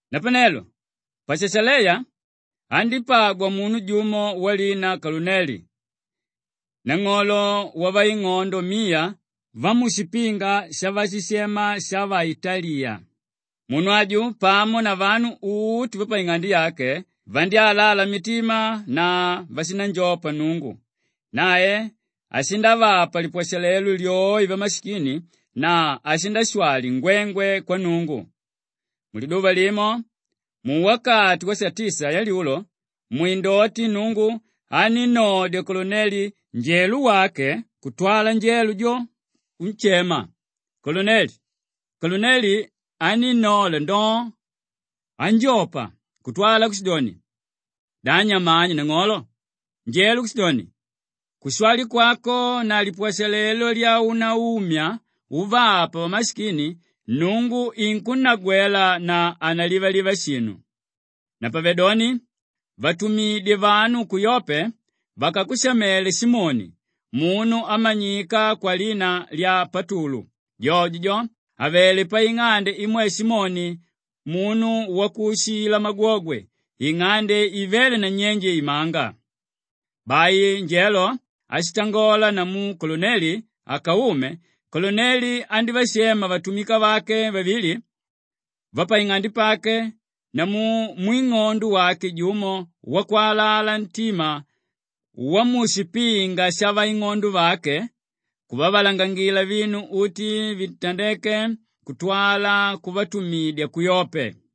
Napanelo pa Shashaleya andípagwa munu jumo walina Koluneli, nang'olo wavaing'ondo miya vamushipinga shavashishema shavaitaliya. Munu aju pamo na vanu uti vapaing'ande yake vandyálala mitima na vashindanjopa Nnungu; nae ashindavapa lipwashalelo lyoe vamashikini na ashindashwali ngwengwe kwa Nnungu. Muliduva limo, muwakati wasatisa yalyulo, mwindoti Nnungu anínnodya Koluneli njelo wake kutwala njelo jo kunshema, “Koluneli!” Koluneli anínnola ndoo, anjopa kutwala kushidoni, “Da nyamani nang'olo?” Njelo kushidoni, “Kushwali kwako na lipwashalelo lyaunaumya uvapa vamashikini Nnungu inkunnagwela na hanalivaliva shinu. Napavedoni vatumidye vanu ku Yope vakakushamele Simoni, munu ámanyika kwalina lya Patulu; jojo jo avelé paing'ande imwe Simoni munu wakuushila magwogwe, ing'ande ivéle nanyenje imanga.” Bai njelo áshitangola namu Koluneli akaume, Koluneli andívashema vatumika vake vavili vapaing'ande pake namu mwing'ondo wake jumo wakwalala ntima wamushipinga shavaing'ondo vake, kuvavalangangila vinu uti vitandéke kutwala kuvatumidya ku Yope.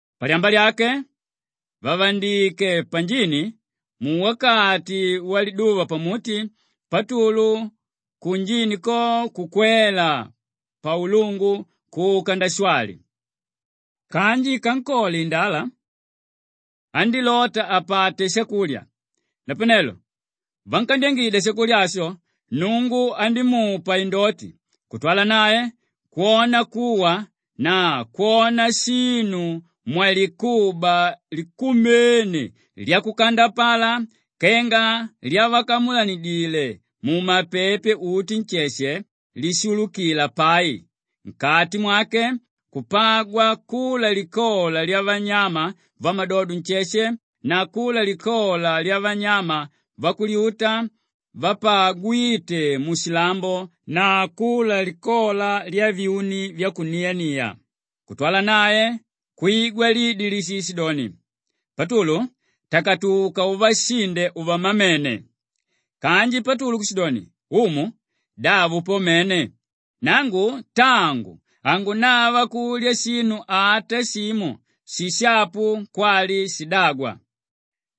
Palyamba lyake vàvandike panjini, muwakati waliduva pamuti Patulu kunjini ko kukwela paulungu kuka ndashwali. Kanji ikankole indala, andílota apate shakulya; napanelo vankandyangidya shakulya asho, Nnungu andímupa indoti kutwala nae kwona kuwa na kwona shinu mwalikuba likumene lyakukandapala kenga lyavakamulanidile mumapepe uti nsheshe lishulukila pai; nkati mwake kupagwa kula likola lyavanyama vamadodo nsheshe na kula likola lyavanyama vakulyuta vapagwíte mushilambo na kula likola lyavyuni vyakuniania. Kutwala nae kwigwa lidi líshishidoni, “Patulu, takatuka uvashinde uvamamene!” Kanji Patulu kushidoni, “Umu! Davo po mene; nangu tangu hangunava kulya shinu ata shimo shishapu kwali shidagwa.”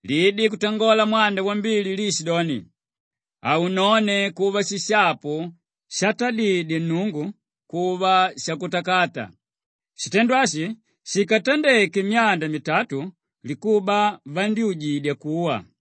Lidi kutangola mwanda wambili liishidoni, “Haunone kuva shishapu shatadidye Nnungu kuva shakutakata!” Shitendo ashi shikatandeke myanda mitatu, likuba vandyújidya kuwa.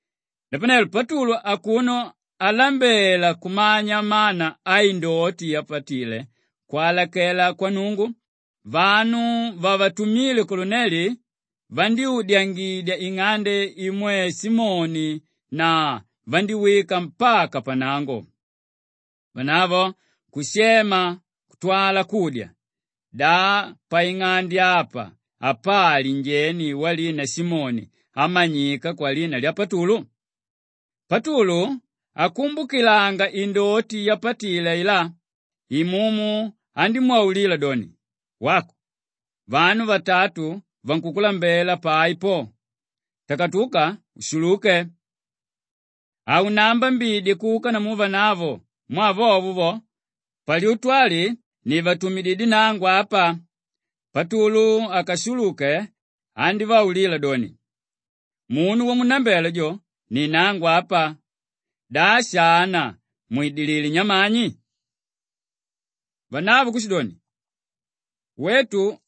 Napanelo Patulu akuno alambela kumanya mana aindoti yapatile kwalakela kwa Nnungu, vanu vavatumile Koluneli vandyúdyangidya ing'ande imwe Simoni na vandíwika mpaka pannango. Vanavo kushema kutwala kudya, “Da paing'ande apa apali njeni walina Simoni ámanyika kwalina lya Patulu?” Patulu akumbukilanga indoti yapatile ailá, Imumu andímwaulila doni, “Wako, vanu vatatu vankukulambela pai po! Takatuka ushuluke! Haunaambambidye kuka namu vanavo mwaa vovo vo, palyutu ali nivatumididye nangu apa.” Patulu akashuluke andívaulila doni, “Munu wamunnambela jo, ni nangu apa. Da shana mwidilidilé nyamani?” Vanavo kushidoni, “Wetu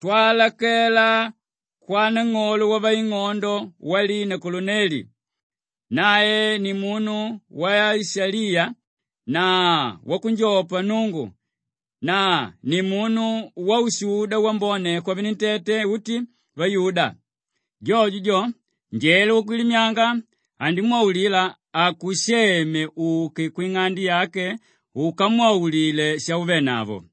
twalakela kwanang'olo wavaing'ondo walina Koluneli; nae ni munu waishaliya na wakunjopa Nnungu na ni munu waushuda wambone kwavenentete uti vayuda. Jojo jo, njelo wakwilimyanga andimwaulila akusheme uke kwing'ande yake ukamwaulile shauvenavo.”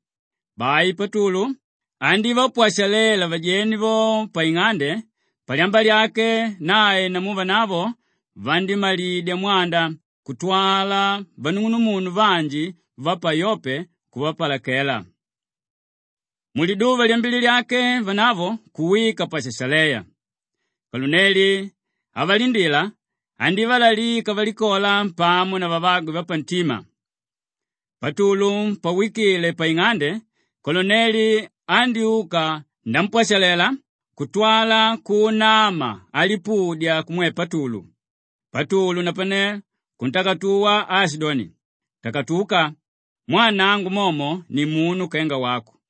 Bai Patulu andívapwashalela vajeni vo paing'ande; palyamba lyake nae namu vanavo vandímalidya mwanda kutwala vanung'unumunu vanji va pa Yope kumpalakela. Muliduva lyambili lyake, vanavo kuwika pa Shashaleya. Koluneli avalindila, andívalalika valikola pamo na vavagwe vapantima. Patulu pawikile paing'ande, Koluneli andyúka ndampwashalela kutwala kuunama alipudya kumwe Patulu. Patulu napane kuntakatuwa aashidoni, “Takatuka! Mwaa nangu momo nimunu kenga wako.”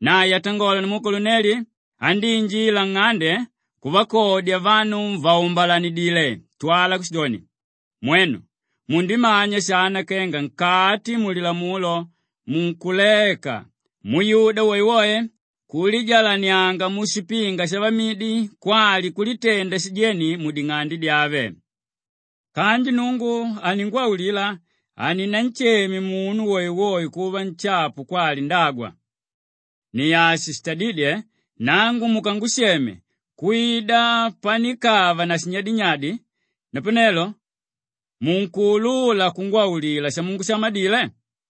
Nae atangola namu Koluneli, andíinjila nng'ande kuvakodya vanu vàumbalanidile kutwala kushidoni, “Mwenu mundimanya shana kenga nkati mulilamulo munkulaeka muyuda woewoe kulijalanianga mushipinga shavamidi kwali kulitenda shijeni muding'ande dyave. Kanji Nnungu aningwaulila haninansheme munu woewoe kuva nshapu kwali ndagwa. Ni ashi shitadídye nangu mukangusheme kwida panikava na shinyadinyadi; napanelo munkuulula kungwaulila shamungushamadile?”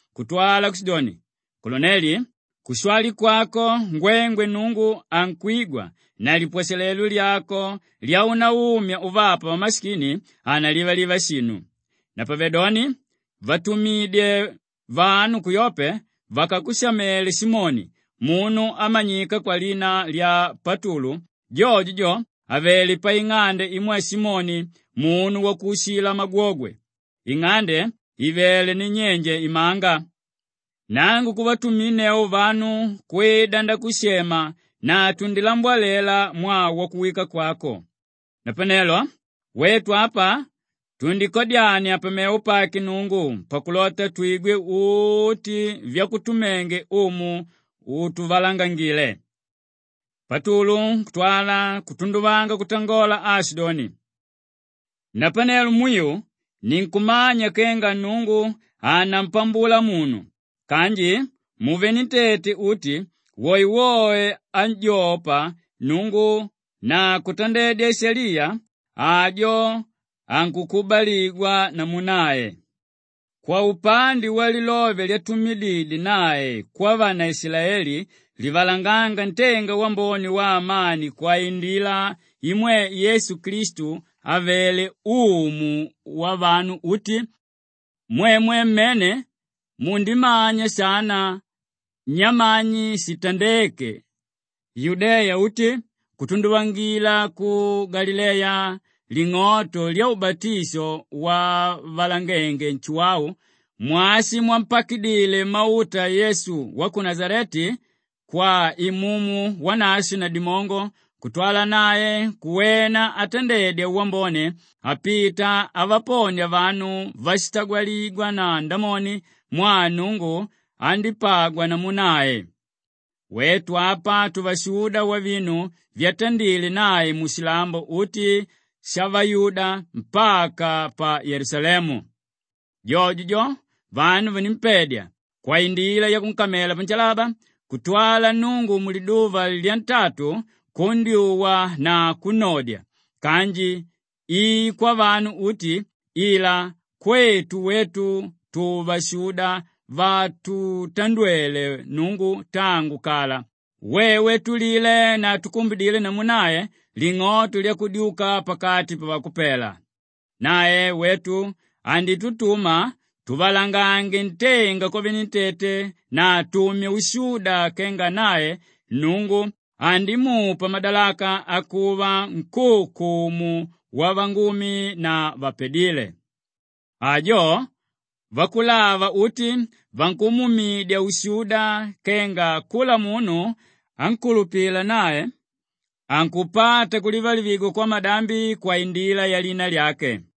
kutwala kushidoni, ‘Koluneli, kushwali kwako ngwengwe Nnungu ankwigwa na lipwashalelo lyako lyaunaumya uvapa vamashikini hanalivaliva shinu. Napavedoni vatumidye vanu ku Yope vakakushamele Simoni, munu ámanyika kwalina lya Patulu; jojo jo avelé paing'ande imwe Simoni munu wakuushila magwogwe, ing'ande ivéle nanyenje imanga.’ Nangu kuvatuminneu vanu kwida ndakushema na tundilambwalela mwaa wakuwika kwako. Napanelo wetu apa tundikadyania pamevo pake Nnungu pakulota twigwe uti vyakutumenge Umu utuvalangangile.” Patulu kutwala kutunduvanga kutangola aashidoni, “Napanelo mwiu ninkumanya kenga Nnungu hanampambula munu kanji muvenentete uti woewoe ánjopa Nnungu na kutandedya ishaliya, ajo ankukubaligwa namu nae. Kwaupande walilove lyatumididye nae kwavanaishilaeli livalangánga ntenga wambone waamani kwaindila imwe Yesu Klistu àvele Umu wavanu uti, mwemwe mmene mundimanya shana nyamani shitandéke Yudeya uti kutunduvangila ku Galileya ling'oto lyaubatisho wavalangenge Nshuwau, mwashi mwampakidile mauta Yesu wa ku Nashaleti kwa Imumu Wanashwe na dimongo kutwala nae kuwena atandedya wambone apita avaponia vanu váshitawaligwa na Ndamoni mwaa Nnungu andípagwa namu nae. Wetu apa tuvashuda wavinu vyatandile nae mushilambo uti shavayuda mpaka pa Yelusalemu. Jojo jo vanu vanímpedya kwaindila yakunkamalela panshalaba kutwala Nnungu muliduva lyantatu kundyuwa na kunnodya kanji i kwavanu uti ila kwetu wetu tuvashuda vátutandwele Nnungu tangu kala, wewe túlile na túkumbidile namu nae ling'oto lyakudyuka pakati pavakupela. Nae wetu anditutuma tuvalangange ntenga kwavenentete na tumye ushuda kenga nae Nnungu andimupa madalaka akuva nkúukumu wavangumi na vapadíle. Ajo vakulava uti vankumuumidya ushuda kenga kula munu ánkulupila nae ankupata kulivalivigwa kwamadambi kwaindila yalina lyake.”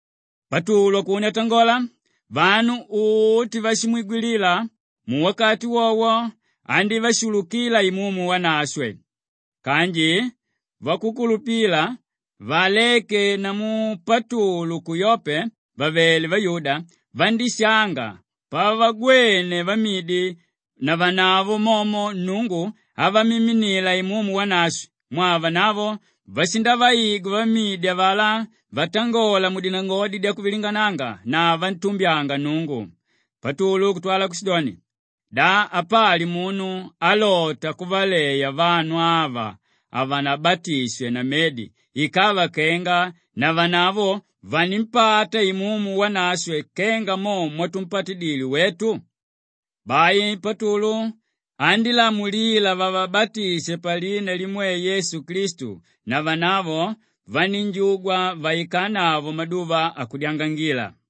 Patulu akuno atangola, vanu uti váshimwigwilila muwakati wowo andívashulukila Imumu Wanashwe. Kanji vakukulupila vaaléke namu Patulu ku Yope vàvele vayuda, vandíshanga pavagwene vamidi navanavo momo Nnungu avamiminila Imumu Wanashwe mwaa vanavo vashindavaigwa vamidi avalá vatangola dinangodi dyakutikinikanga na vantumbyanga Nnungu. Patulu kutwala kushidoni, “Da apali munu álota kuvaleya vanu ava havanabatishwe na medi ikava kenga navanavo vanimpata Imumu Wanashwe kenga mo mwatumpatidile wetu?” Bai Patulu andílamulila vavabatishe palina limwe Yesu Klistu na vanavo vanínjugwa vaikanavo maduva akudyangangila.